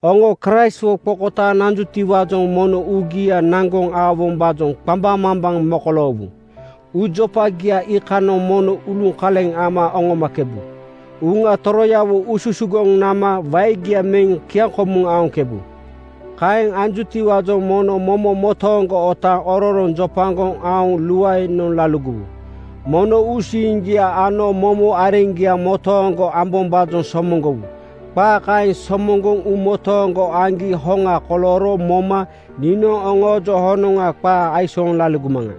Oŋo Kraistwo qokotaaŋ nanjutiwaajoŋ mono uugia naŋgoŋ aowombaajoŋ qambaŋmambaŋ mokoloowu. Uujopagia iikanoŋ mono uluŋkoleŋ ama aoŋkebu. Uŋa Toroyawo ususugoŋ nama waegia meŋ kiaŋkomuŋ aoŋkebu. Kaeŋ anjutiwaajoŋ mono momo motooŋgo otaaŋ ororoŋ jopagoŋ aoŋ luaenoŋ laligowu. Mono uusiiŋgia ano momo areŋgia motooŋgo ambombaajoŋ somoŋgowu. Qaa kaeŋ somoŋgoŋ uumotooŋgo aŋgi hoŋa kolooro moma niinoŋ oŋoojoŋ honoŋa qaa aisooŋ laligomaŋa.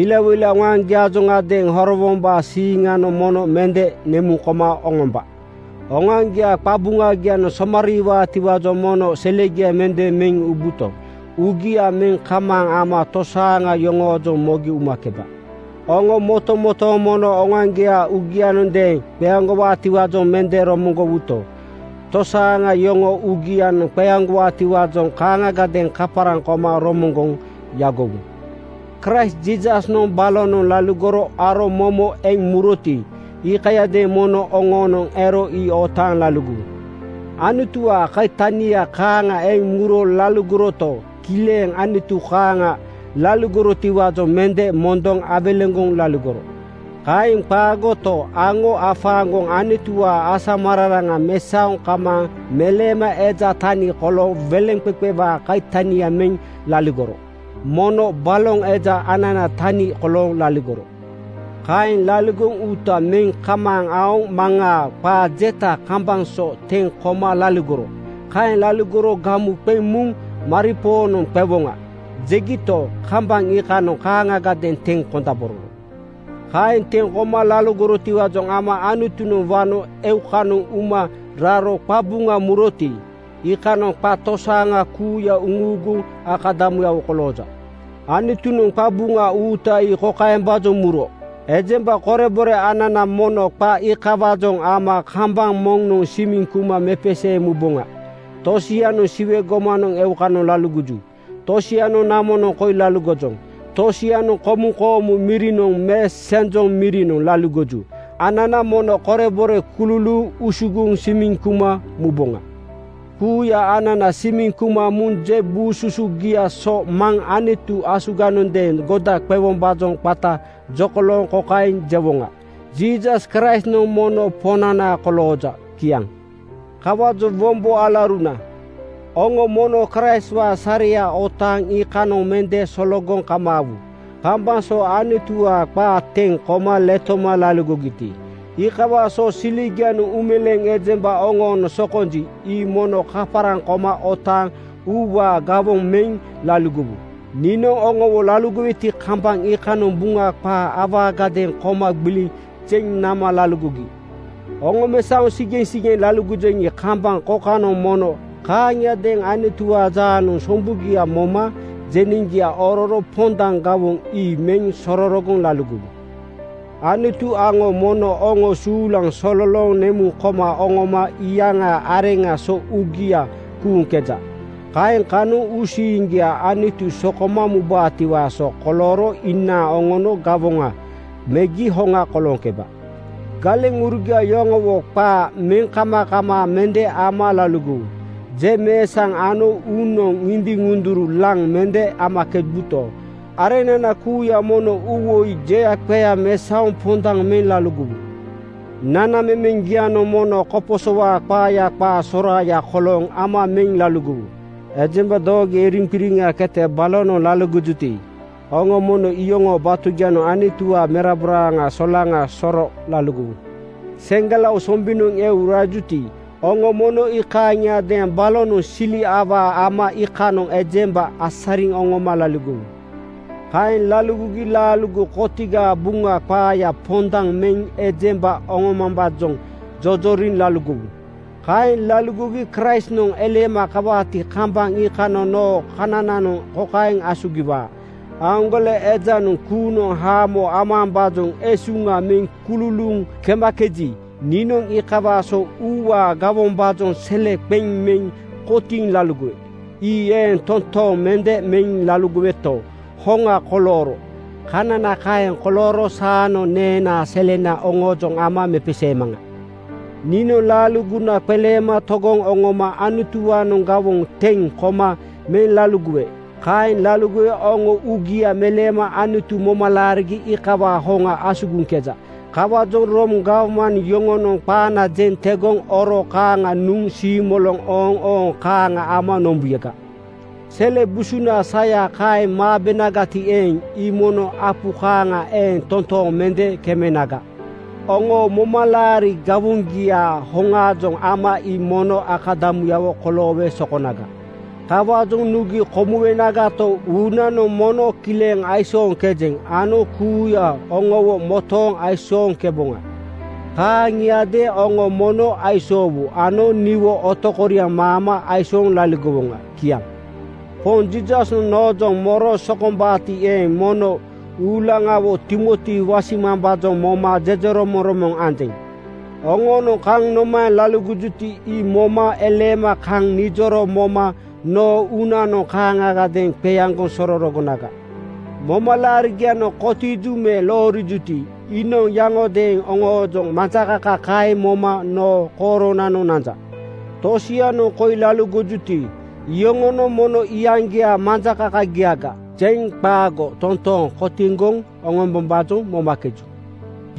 Ilawoila oŋoaŋgiaajoŋadeeŋ horowombaa siiŋanoŋ mono mende nemuŋ koma oŋomba. Oŋoaŋgiaa qabuŋagianoŋ somariiwaatiwaajoŋ mono selegia mende meŋ ubuto, uugia meŋ kamaaŋ ama tosaaŋa yoŋoojoŋ mogi umakeba. Oŋo motomotooŋ mono oŋoaŋgiaa uugiagadeeŋ qeaŋgowaatiwaajoŋ mende romoŋgowuto, tosaaŋa yoŋoo uugianoŋ qeaŋgowaatiwaajoŋ kaaŋagadeeŋ kaparaŋ koma romoŋgoŋ yagowu. Kraist Jiisasnoŋ balonoŋ laligoro aro momo eŋ muroti, iikayadeeŋ mono oŋoonoŋ ero ii otaaŋ laligowu. Anutuwaa kaitani kaaŋa eŋ muro laligoroto, kileŋ Anutu kaaŋa laligorotiwaajoŋ mende mondoŋ awelegoŋ laligoro. Kaeŋ qaagoto, aŋo afaaŋgoŋ Anutuwaa asamararaŋa mesaoŋ kamaaŋ meleema eja tani kolooŋ weleŋqeqewaa kaitania meŋ laligoro. Mono baloŋ eja ananaa tani kolooŋ laligoro. Kaeŋ laligoŋ uuta meŋ kamaaŋ aoŋ Maŋaa qaa jeta kambaŋ so teŋ koma laligoro. Kaeŋ laligoro gamu qeŋ muŋ “Maripoonoŋ qewoŋa,” jegito, kambaŋ iikanoŋ kaaŋagadeeŋ teŋ kondabororo. Kaeŋ teŋ koma laligorotiwaajoŋ ama Anutunoŋ wano eukanoŋ uma raro qabuŋa muroti, iikanoŋ qa tosaaŋa kuuya uŋuuguŋ akadamuyawo kolooja. Anutunoŋ qabuŋa uuta ii kokaembaajoŋ muro: Ejemba korebore anana mono qa iikawaajoŋ ama kambaŋ moŋnoŋ simiŋ kuma mepeseeŋ muboŋa. Tosianoŋ Siwe gomanoŋ eukanoŋ laligoju. Tosianoŋ namonoŋ koi laligojoŋ. Tosianoŋ komuŋ koomu mirinoŋ me senjoŋ mirinoŋ laligoju. Anana mono korebore kululuuŋ usugoŋ simiŋ kuma muboŋa. Kuuya anana simiŋ kuma muŋ je buu susugia so Maŋ Anutu asuganoŋ goda qewombaajoŋ qata jokolooŋ kokaeŋ jewoŋa, “Jiisas Kraistnoŋ mono Poŋnana kolooja.” Kiaŋ. Kawaajoŋ wombo alauruna, oŋo mono Kraistwaa sareya otaaŋ iikanoŋ mende sologoŋ kamaawu. Kambaŋ so Anutuwaa qaa teŋ koma letoma laligogiti, iikawaa so siligianoŋ uumeleeŋ ejemba oŋoonoŋ sokonji, ii mono kaparaŋ koma otaaŋ uuwaa gawoŋ meŋ laligowu. Niinoŋ oŋowo laligoweti, kambaŋ iikanoŋ Buŋa qaa awaagadeeŋ koma gbiliŋ zeŋ nama laligogi. Oŋomesaoŋ sigeŋsigeŋ laligojeŋi, kambaŋ kokanoŋ mono kaaŋiadeeŋ Anutuwaa jaanoŋ sombugia moma jeneŋgia ororo pondaŋ gawoŋ ii meŋ sororogoŋ laligowu. Anutu aŋo mono oŋo suulaŋ sololooŋ nemuŋ koma oŋoma iyaŋaa areŋaa so uugia kuuŋkeja. Kaeŋ kanoŋ uusiiŋgia Anutu sokoma mubaatiwaa so kolooro inaaŋ oŋono gawoŋa megi hoŋa kolooŋkeba. Galeŋurugia yoŋowo qaa meŋkamakamaa mende ama laligowu. Jeŋmeesaŋ ano uunoŋ ŋindiŋ-ŋunduru laŋ mende amakebuto, areŋnana kuuya mono uuwoi jeaqea mesaoŋ pondaŋ meŋ laligowu. Nanamemeŋgianoŋ mono koposowaa qaaya qaa soraaya kolooŋ ama meŋ laligowu. Ejemba doogoya iriŋqiriŋa kete balonoŋ laligojuti, oŋo mono iyoŋoo batugianoŋ Anutuwaa merabora solaŋa soro laligowu. Seŋgelao sombinoŋ eu asarijuti, oŋo mono kaaŋiadeeŋ balonoŋ sili awaa ama iikanoŋ ejemba asariŋ oŋoma laligowu. Kaeŋ laligoŋ laaligo kotigaa Buŋa qaaya pondaŋ meŋ ejemba oŋombombaajoŋ jojoriŋ laligowu. Kaeŋ laligogi Kraistnoŋ eleema kawaati, kambaŋ iikanoŋ noo kanananoŋ kokaeŋ asugiwaa, “Aaŋgole ejanoŋ kuunoŋ haamo amambaajoŋ esuŋa meŋ kululuuŋ kemakeji, niinoŋ iikawaa so uuwaa gawombaajoŋ sele qeŋ meŋ kotiiŋ laligowe. Ii eeŋ toontooŋ mende meŋ laligoweto, hoŋa kolooro.” Kanana kaeŋ kolooro saanoŋ neenaa selena oŋoojoŋ ama mepeseemaŋa. Niinoŋ laaligona qeleema togoŋ oŋoma Anutuwaanoŋ gawoŋ teŋ koma meŋ laligowe. Kaeŋ laligowe oŋo uugia meleema Anutu moma laarigi iikawaa hoŋa asugiŋkeja. Kawaajoŋ Room gawman yoŋonoŋ qaana jeŋ tegoŋ oro kaaŋa nuŋ siimoloŋ ooŋooŋ kaaŋa ama nombuyaga. Sele busunaa saya kaeŋ maabenagati eeŋ, ii mono apu kaaŋa eeŋ totooŋ mende kemenaga. Oŋoo momalaari gawoŋgiaa hoŋaajoŋ ama ii mono akadamuyawo koloowe sokonaga. Kawaajoŋ nugi komuwenagato, uunanoŋ mono kileŋ aisooŋkejeŋ ano kuuya oŋowo motooŋ aisooŋkeboŋa. Kaaŋiadeeŋ oŋo mono aisoowu ano niwo otokoriaŋ maama aisooŋ laligowoŋa. Kiaŋ. Poŋ Jiisasnoŋ noojoŋ moro sokombaati eeŋ, mono uulaŋawo Timoti wasimambaajoŋ moma jejeromoŋromoŋ anjeŋ. Oŋoonoŋ kaŋ nomaeŋ laligojuti, ii moma eleema kaŋ nijoro moma noo uunanoŋ kaaŋagadeeŋ qeaŋgoŋ sororogonaga. Momalaarigianoŋ kotiiju me loorijuti, iinoŋ yaŋodeeŋ oŋoojoŋ majakaka kaeŋ moma noo kooronanoŋ nanja. Tosianoŋ koi laligojuti, iyoŋonoŋ mono “Iyaŋgiaa majakakagiaga,” jeŋ qaago totooŋ kotiŋgoŋ oŋombombaajoŋ momakeju.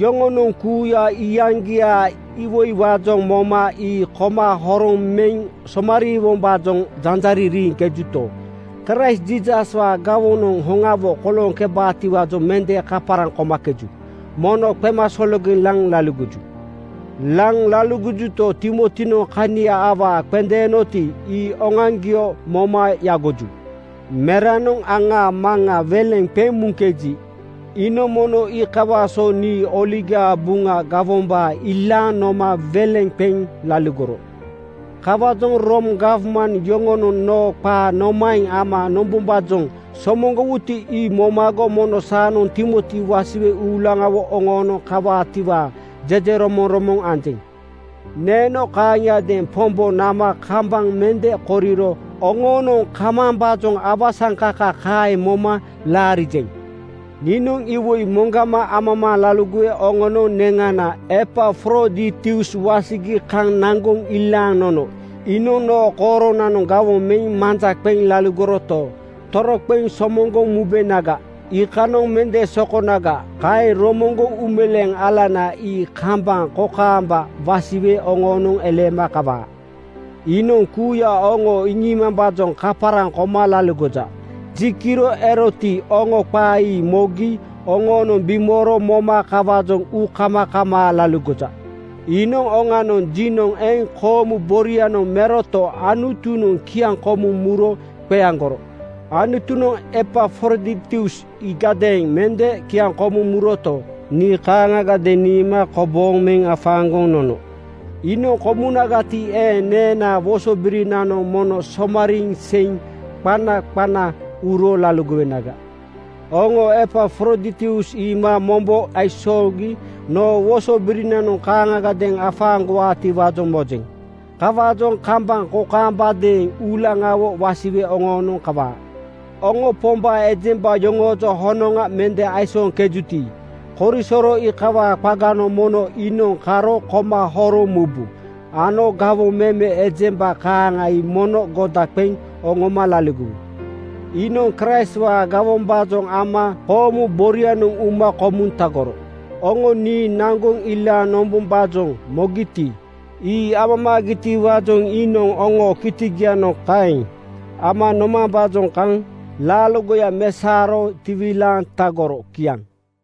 Yoŋonoŋ kuuya iyaŋgiaa iwoiwaajoŋ moma ii koma horoŋ meŋ somariiwombaajoŋ janjariŋ riiŋkejuto, Kraist Jiisaswaa gawoŋanoŋ hoŋawo kolooŋkebaatiwaajoŋ mende kaparaŋ komakeju. Mono qemasologeŋ laŋ laligoju. Laŋ laligojuto, Timotinoŋ kania awaa qendeenoti, ii oŋoaŋgio moma yagoju. Meranoŋ aŋaa maŋa weleŋ qeŋ muŋkeji, iinoŋ mono iikawaa so nii Oligaa Buŋa gawombaa ilaaŋ noma weleŋ qeŋ laligoro. Kawaajoŋ Room gawman yoŋonoŋ noo qaa nomaeŋ ama nombombaajoŋ somoŋgowuti, ii momago mono saanoŋ Timoti wasiwe uulaŋawo oŋoonoŋ kawaatiwaa jejeromoŋromoŋ anjeŋ. Neeno kaaŋiadeeŋ Pombo nama kambaŋ mende koriro oŋoonoŋ kamambaajoŋ awasaŋkaka kaeŋ moma laarijeŋ. Niinoŋ iwoi moŋgama amamaaŋ laligowe oŋonoŋ neŋana Epafroditus wasigi kaŋ naŋgoŋ ilaaŋ nono. Iinoŋ noo kooronanoŋ gawoŋ meŋ manja qeŋ laligoroto, toroqeŋ somoŋgoŋ mubenaga, iikanoŋ mende sokonaga. Kaeŋ romoŋgoŋ uumeleeŋ alana ii kambaŋ kokaambaga wasiwe oŋoonoŋ eleema kawaa. Iinoŋ kuuya oŋo iŋiimambaajoŋ kaparaŋ koma laligoja. Ji kiro eroti, oŋo qaa ii mogi oŋoonoŋ bimooro moma kawaajoŋ uukamakamaa laligoja. Iinoŋ oŋanoŋ jinoŋ eŋ koomu borianoŋ meroto, Anutunoŋ kiaŋkomuŋ muro qeaŋgoro. Anutunoŋ Epafroditus iigadeeŋ mende kiaŋkomuŋ muroto, nii kaaŋagadeeŋ niima kobooŋ meŋ afaaŋgoŋ nono. Iinoŋ komunagati eeŋ, neenaa wosobirinanoŋ mono somariiŋ seiŋ qana qana uro laligowenaga. Oŋo Epafroditus iima mombo aisoogi noo wosobirinanoŋ kaaŋagadeeŋ afaaŋgowaatiwaajoŋ mojeŋ. Kawaajoŋ kambaŋ kokaambadeeŋ uulaŋawo wasiwe oŋoonoŋ kawaa. Oŋo Pombaa ejemba yoŋoojoŋ honoŋa mende aisooŋkejuti, korisoro iikawaa qaganoŋ mono iinoŋ karo koma horoŋ mubu ano gawoŋ meme ejemba kaaŋa ii mono goda qeŋ oŋoma laligowu. Iinoŋ Kraistwaa gawombaajoŋ ama koomu borianoŋa uma komuŋ tagoro. Oŋo nii naŋgoŋ ilaaŋ nombombaajoŋ mogito, ii amamaagitiwaajoŋ iinoŋ oŋoo kitigianoŋ kaeŋ ama nomambaajoŋ kaŋ laaligoya mesaoro tiwilaaŋ tagoro. Kiaŋ.